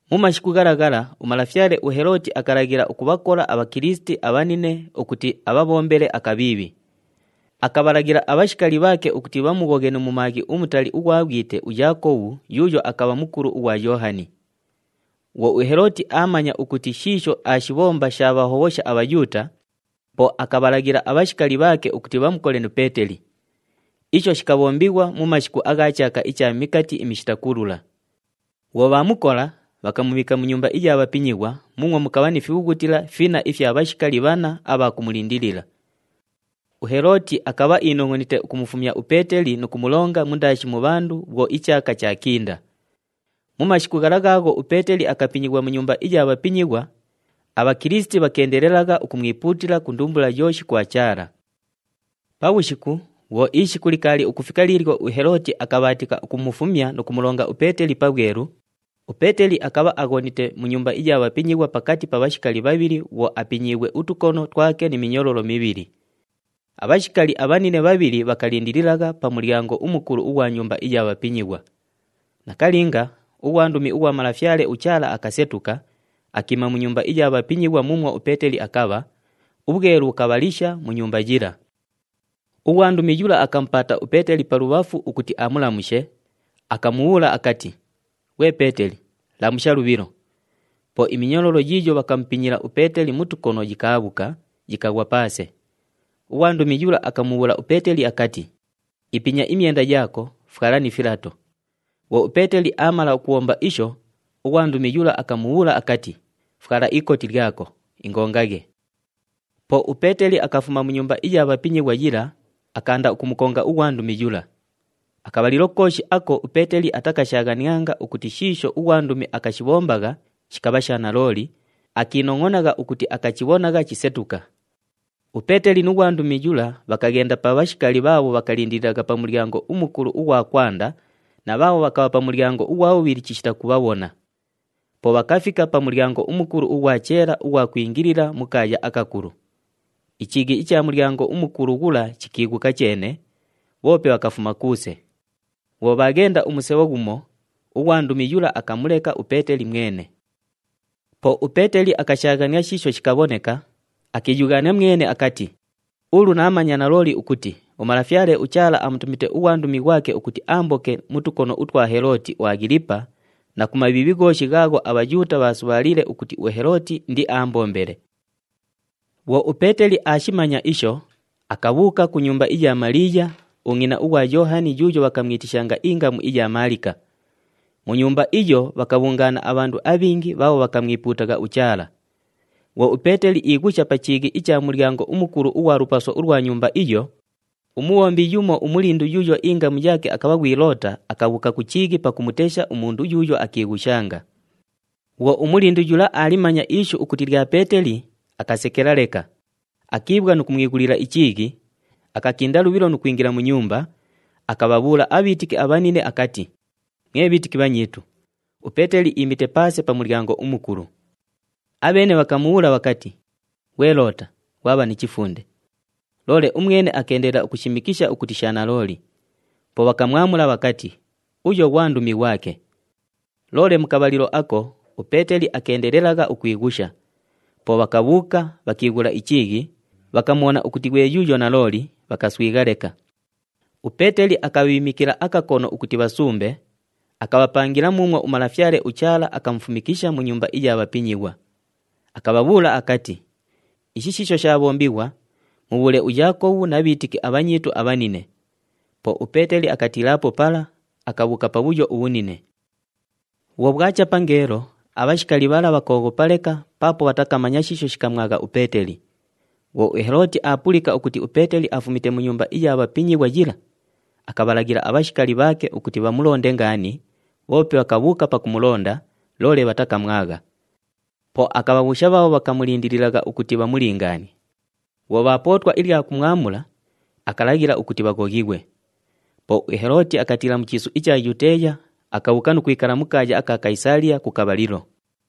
Mu mashiku ghala ghala umalafyale uHelooti akalaghila ukubhakola aBhakilisiti abhanine ukuti abhabhombele akabhiibhi. Akabhalaghila abhashikali bhaake ukuti bhamughoghe nu mumaaghi umutali ughwa bhwite uYaakobhu yuuyo akabha mukulu ughwa Yoohani. Bhwo uHelooti aamanya ukuti shiisho aashibhomba shaabhahobhosha aBhayuuta, po akabhalaghila abhashikali bhaake ukuti bhamukole nu Peeteli. Isho shikabhombighwa mu mashiku agha chaaka icha Mikati iMishita Kulula. Bhwo bhaamukola, bhakamubhiika mu nyumba iya bhapinyighwa muumwo mukabha ni fibhughutila finna ifya bhashikali bhanna abha kumulindilila. UHelooti akabha iinongʼonite ukumufumya uPeeteli nu kumulonga mundaashi mu bhandu bhwo ichaaka chaakinda. Mu mashiku ghala ghaagho uPeeteli akapinyighwa mu nyumba iya bhapinyighwa, aBhakilisiti bhakeendelelagha ukumwipuutila ku ndumbula yooshi kwa Chaala. Pabhushiku, bhwo ishiku likaali ukufika liilyo uHelooti akabhaatika ukumufumya nu kumulonga uPeeteli pabhwelu, uPeeteli akabha aghonite mu nyumba iya bhapinyighwa pakati pa bhashikali bhabhili bhwo apinyiighwe utukono twake ni minyololo mibhili. Abhashikali abhanine bhabhili bhakalindililagha pa mulyango umukulu ughwa nyumba iya bhapinyighwa. Nakalinga, ughwandumi ughwa Malafyale uChaala akasetuka, akiima mu nyumba iya bhapinyighwa muumwo uPeeteli akabha, ubhwelu bhukabhalisha mu nyumba yila. Ughwandumi yula akamupaata uPeeteli pa lubhafu ukuti amulamushe, akamubhuula akati, “Ghwe Peeteli, lamusha lubhilo!” Po iminyololo yiiyo bhakamupinya uPeeteli mu tukono yikaabhuka, yikaghwa paase. Ughwandumi yula akamubhuula uPeeteli akati, “Ipinya imyenda yaako, fwala ni filato.” Bhwo uPeeteli aamala ukubhomba isho, ughwandumi yula akamubhuula akati, “Fwala ikoti lyako, ingongaghe!” Po uPeeteli akafuma mu nyumba iya bhapinyighwa yila, akaanda ukumukonga ughwandumi yula. Akabhalilo kooshi ako uPeeteli atakashaaghanianga ukuti shiisho ughwandumi akashibhombagha shikabha sha nalooli, akiinongʼonagha ukuti akachibhonagha chisetuka. UPeeteli nu ghwandumi yula bhakaghenda pa bhashikali bhaabho bhakalindililagha pa mulyango umukulu ughwa kwanda na bhaabho bhakabha pa mulyango ughwa bhubhili chishita kubhabhona. Po bhakafika pa mulyango umukulu ughwa cheela ughwa kwingilila mu kaaya akakulu. Ichiighi icha mulyango umukulu ghula chikiighuka cheene, bhoope bhakafuma kuuse. Bhwo bhaaghenda umusebho ghumo, ughwandumi yula akamuleka uPeeteli mwene. Po uPeeteli akashaaghania shiisho shikabhoneka, akiiyughaania mwene akati, “Ulu naamanya nalooli ukuti uMalafyale uChaala amutumite ughwandumi ghwake, ukuti aamboke mu tukono utwa Helooti uAghilipa na ku mabhiibhi ghooshi, ghaagho aBhayuuta bhaasubhaaliile ukuti uHelooti indiaambombele.” Bhwo uPeeteli aashimanya isho, akabhuuka ku nyumba iya Maliiya, ungʼina ughwa Yoohani yuuyo bhakamwitishanga ingamu iya Maalika. Mu nyumba iyo, bhakabhungaana abhandu abhingi bhaabho bhakamwipuutagha uChaala. Bhwo uPeeteli iighusha pa chiighi icha mulyango umukulu ughwa lupaso ulwa nyumba iyo, umubhombi yumo umulindu yuuyo ingamu yaake akabha ghwi Loota akabhuuka ku chiighi pakumutesha umundu yuuyo akiighushanga. Bhwo umulindu yula aalimanya ishu ukuti lya Peeteli, akasekela leka, akiibhwa nu kumwighulila ichiighi, akakinda lubhilo nu kwingila mu nyumba, akabhabhuula abhiitiki abhanine akati, “Mwe bhiitiki bhanyiitu, uPeeteli iimite paase pa mulyango umukulu!” Abheene bhakamubhuula bhakati, “Ghwe Loota, ghwabha ni chifunde!” Loole umwene akeendelela ukushimikisha ukuti sha nalooli. Po bhakamwamula bhakati, “Uyo ghwandumi ghwake!” Loole mu kabhalilo ako uPeeteli akeendelelagha ukwighusha. Po bhakabhuuka, bhakiighula ichiighi, bhakamubhona ukuti ghwe yuuyo nalooli, bhakaswigha leka. UPeeteli akabhiimikila akakono ukuti bhasumbe, akabhapangila muumwo uMalafyale uChaala akamufumikisha mu nyumba iya bhapinyighwa. Akabhabhuula akati, “Ishi shiisho shaabhombighwa, mubhuule uYaakobhu na bhiitiki abhanyiitu abhanine.” Po uPeeteli akatiilaapo pala, akabhuuka pabhuyo ubhunine. Bhwo bhwacha pangeelo, abhashikali bhala bhakooghopa leka paapo bhatakamanya shiisho shikamwagha uPeeteli. Bhwo uHelooti aapulika ukuti uPeeteli afumite mu nyumba iya bhapinyighwa yila, akabhalaghila abhashikali bhaake ukuti bhamulonde ngaani, bhoope bhakabhuuka pakumulonda, loole bhatakamwagha. Po akabhabhuusha bhaabho bhakamulindililagha ukuti bhamulingaanie. Bhwo bhaapootwa ilya kumwamula, akalaghila ukuti bhaghoghighwe. Po uHelooti akatiila mu chiisu icha Yuteeya, akabhuuka nu kwikala mu kaaya aka Kayisaaliya ku kabhalilo.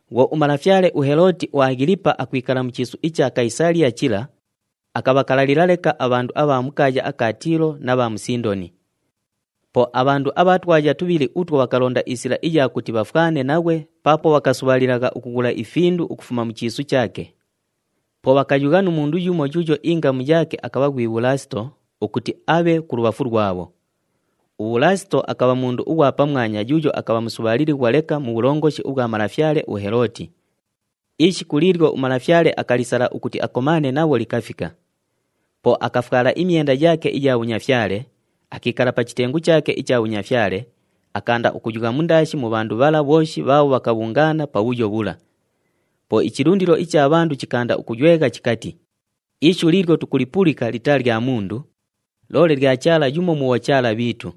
Bhwo umalafyale uHelooti uAghilipa akwikala mu chiisu icha Kayisaaliya chila, akabhakalalila leka abhandu abha mu kaaya aka Tiilo na bha mu Sindoni. Po abhandu abha twaya tubhili utwo bhakalonda isila iya kuti bhafwane naghwe paapo bhakasubhaalilagha ukughula ifindu ukufuma mu chiisu chaake. Po bhakayugha nu mundu yumo yuuyo ingamu yaake akabha ghwi Bhulaasito ukuti abhe kulubhafu lwabho. UBhulaasito akabha mundu ughwa pamwanya yuuyo akabha musubhaalilighwa leka mu bhulongoshi ubhwa malafyale uHelooti. Ishiku liilyo umalafyale akalisala ukuti akomaane nabho likafika. Po akafwala imyenda yaake iya bhunyafyale, akiikala pa chitengu chaake icha bhunyafyale, akaanda ukuyugha mundaashi mu bhandu bhala bhooshi bhaabho bhakabhungaana pabhuyo bhula. Po ichilundilo icha bhandu chikaanda ukuywegha chikati, “Ishu liilyo tukulipulika litaa lya mundu, loole lya chaala yumo mu bhochaala bhiitu!”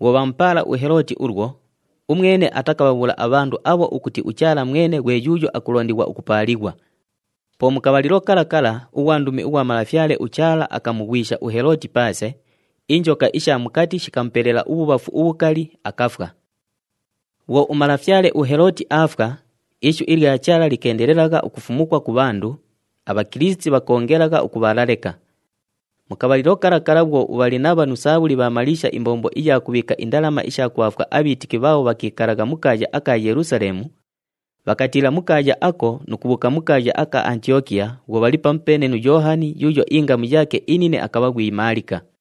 Bhwo bhaamupaala uHelooti ulwo, umwene atakabhabhuula abhandu abho ukuti uChaala mwene ghwe yuuyo akulondighwa ukupaalighwa. Po mu kabhalilo kala kala ughwandumi ughwa Malafyale uChaala akamughwisha uHelooti paase, injoka isha mukati shikamupelela ubhubhafu ubhukali, akafwa. Bhwo umalafyale uHelooti aafwa, ishu ilya Chaala likeendelelagha ukufumukwa ku bhandu, aBhakilisiti bhakoongelagha ukubhaala leka. Mu kabhalilo kala kala bhwo uBhalinabha nu Saabhuli bhaamaliisha imbombo iya kubhiika indalama isha kubhaafwa abhiitiki bhaabho bhakiikalagha mu kaaya aka Yelusaleemu, bhakatiila mu kaaya ako nu kubhuuka mu kaaya aka Antiyokiya, bhwo bhali pamupeene nu Yoohani yuuyo ingamu yaake inine akabha ghwi Maalika.